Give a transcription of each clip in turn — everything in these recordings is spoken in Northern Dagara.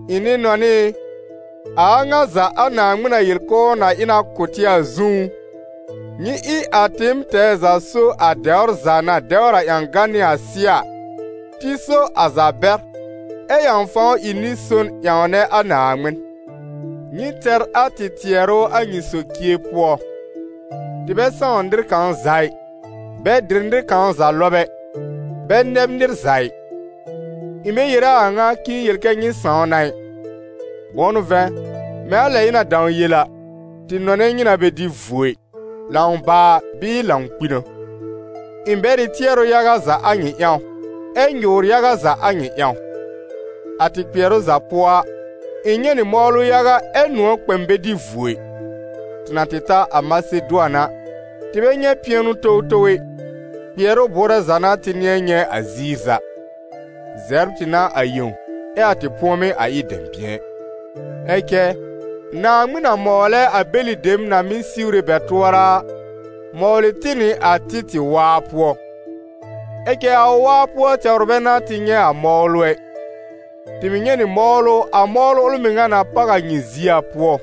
Ɩ̃ nɩ-nɔnɩ ɩ, a a ŋa za a Naaŋmɩn na yel k'ʋʋ na ɩ na kʋ̀ tɩ a zũú, nyɩ ɩ a tɩɩm tɛɛ za so a dɛwr za na dɛwr a ƴãgan nɩ a sɩ́ɛ a, tɩ so a za bɛr, ɛ ƴãw fãw ɩ nɩ-son ƴãwnɛ a Naaŋmɩn. Nyɩ tɛr a tɩ tɩɛrʋ a nyɩ socie pʋɔ. Tɩ bɛ sãw nɩr kãw za ɩ, bɛ dɩ nɩr kãw za lɔb ɛ, bɛ nɛb nɩr za ɩ. Ɩ̃ bɛ yere a a ŋa k'ɩ̃ɩ yel kɛ́ nyɩ sãw na ɩ. Bʋ̃ʋ n'ʋ vɛ̃, mɛ̃ a lɛ ɩ̃ na dãw yel a, tɩ nɔnɛ nyɩ na bɛ dɩ vuo ɩ, lãw baa bɩɩ lãw kpi n'a. Ɩ̃ bɛr ɩ tɩɛrʋ yaga za a nyɩ ƴãw, ɛ nyʋʋr yaga za a nyɩ ƴãw. A tɩ kpɩɛrʋ za pʋɔ a, ɩ̃ nyɛ̃ nɩ mɔwlʋ yaga ɛ nʋ̃ɔ̀ kpɛ m bɛ dɩ vuo ɩ. Tɩ na tɩ ta a Masedʋan a, tɩ bɛ nyɛ̃ pɩɛnʋ towtow ɛ, kpɩɛrʋ bʋʋrɛ za n'a tɩ nɩ̃ɛ nyɛ̃ a ziir za: zɛbr tɩ n'a a yẽw, ɛ a tɩ pʋ̃ɔmɩ́ a ɩ dɛ̃bɩ̃ɛ. Ɛ cɛ Naaŋmɩn na mɔwlɛ a bɛlɩ dem na mɩ́ siwre bɛ tʋɔra a, mɔwlɩ tɩ nɩ a Títɩ̀ waa pʋɔ. Ɛ cɛ a ʋ waa pʋɔ tɛwr bɛ n'a tɩ nyɛ̃ a mɔwlʋ ɛ, tɩ mɩ̀ nyɛ̃ nɩ mɔwlʋ, a mɔwlʋ ʋl mɩŋa na páw a nyɩ zie a pʋɔ.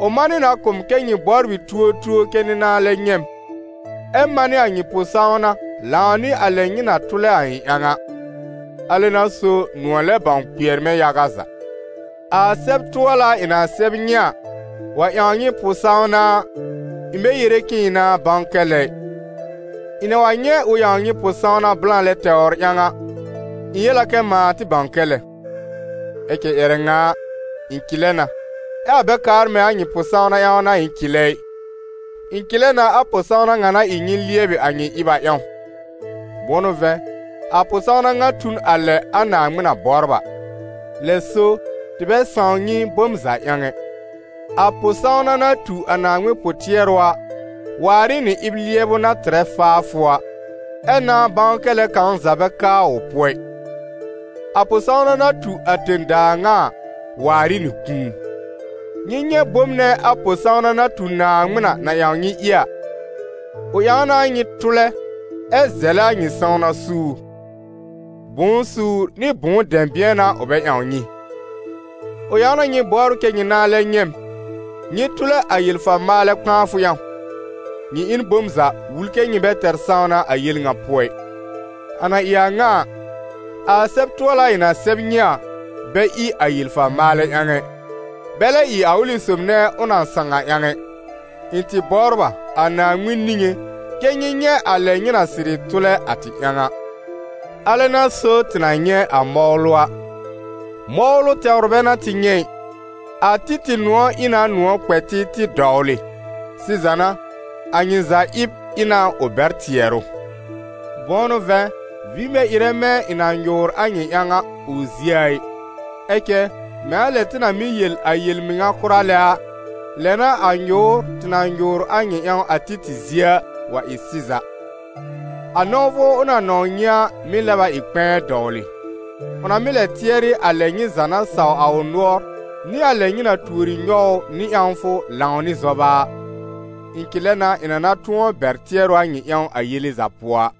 Ʋ manɩ na kʋ̀ m kɛ́ nyɩ bɔbr ɩ tuotuo kɛ́ nyɩ nãa lɛ nyɛ̃ m, ɛ manɩ a nyɩ pʋ-sãwna lãw nɩ a lɛ nyɩ na tʋlɛ a ɩ̃ ƴãw a. Alɛ n'a so nʋ̃ɔ̀ lɛb bãw kpɩɛr mɛ̃ yaga za. A sɛb-tʋɔla ɩ̃ na sɛb nyɩ a wa ƴãw nyɩ pʋ-sãwna a, ɩ̃ bɛ yere k'ɩ̃ɩ nãá bãw kɛ lɛ ɩ. Ɩ̃ na wa nyɛ̃ ʋ ƴãw nyɩ pʋ-sãwna blã lɛ tɛwr ƴãw a, ɩ̃ yel a kɛ mãa tɩ bãw kɛ lɛ. Ɛ cɛ ƴɛrɛ ŋa a, ɩ̃ cɩlɛ na, ɛ a bɛ kaar mɛ̃ a nyɩ pʋ-sãwna ƴãw n'a ɩ̃ cɩlɛ ɩ, ɩ̃ cɩlɛ na a pʋ-sãwna ŋa na ɩ nyɩ lɩɛbɩ a nyɩ ɩb a ƴãw. Bʋ̃ʋ n'ʋ vɛ̃, a pʋ-sãwna ŋa tu n a lɛ a Naaŋmɩn na bɔbr a. Lɛ so, tɩ bɛ sãw nyɩ bom za ƴãw ɛ. A pʋ-sãwna na tu a Naaŋmɩn pʋ-tɩɛrʋ a waar ɩ nɩ ɩb-lɩɛbʋ na tɩrɛ faafʋ a, ɛ nãa-bãw-kɛ-lɛ kãw za bɛ ka ʋ pʋɔ ɩ. A pʋ-sãwna na tu a tẽ-daa ŋa a waar ɩ nɩ kũu. Nyɩ nyɛ̃ bom nɛ a pʋ-sãwna na tu Naaŋmɩn a na ƴãw nyɩ ɩ a: ʋ ƴãw na nyɩ tʋlɛ, ɛ zɛlɛ a nyɩ sãwna suur; bʋ̃ʋ suur nɩ bʋ̃ʋ dɛ̃bɩ̃ɛ n'a ʋ bɛ ƴãw nyɩ! Ʋ ƴãw na nyɩ bɔbr kɛ nyɩ nãa lɛ nyɛ̃ m, nyɩ tʋlɛ a yel-fa-maalɛ kpãafʋ ƴãw. Nyɩ ɩ n bom za wul kɛ́ nyɩ bɛ tɛr sãwna a yel ŋa pʋɔ ɩ. A na ɩ a ŋa a, a sɛb-tʋɔla ɩ̃ na sɛb nyɩ a, bɛ ɩ a yel-fa-maalɛ ƴãw ɛ, bɛ lɛ ɩ a ʋlɩ sob nɛ ʋ na sãw a ƴãw ɛ. Ɩ̃ tɩ bɔbr a, a Naaŋmɩn niŋé, kɛ́ nyɩ nyɛ̃ a lɛ nyɩ na sɩrɩ tʋlɛ a tɩ ƴãw a. Alɛ n'a so tɩ na nyɛ̃ a mɔwlʋ a. Mɔwlʋ tɛwr bɛ n'a tɩ nyɛ̃ ɩ. A Títɩ̀ nʋ̃ɔ̀ ɩ na nʋ̃ɔ̀ kpɛ tɩ tɩ dɔwlɩ. Sɩza n'a, a nyɩ za ɩb ɩ na ʋ bɛr tɩɛrʋ. Bʋ̃ʋ n'ʋ vɛ̃, vĩ bɛ ɩrɛ mɛ̃ ɩ̃ na nyʋʋr a nyɩ ƴãw a ʋ zie a ɩ. Ɛ cɛ mɛ̃ a lɛ tɩ na mɩ́ yel a yel-mɩŋa kʋra lɛ a, lɛ n'a a nyʋʋr, tɩ na nyʋʋr a nyɩ ƴãw a Títɩ̀ zie a, wa ɩ sɩza. A nɔ̃wfʋ ʋ na nɔ̃w nyɩ a mɩ́ lɛb a ɩ kpɛ̃ɛ dɔwlɩ, ʋ na mɩ́ lɛ tɩɛrɩ a lɛ nyɩ za na saw a ʋ nʋɔr nɩ a lɛ nyɩ na tuori nyɔw ʋ nɩ ƴãwfʋ lãw nɩ zɔba a. Ɩ̃ cɩlɛ na ɩ̃ na na tʋ̃ɔ bɛr tɩɛrʋ a nyɩ ƴãw a yele za pʋɔ a.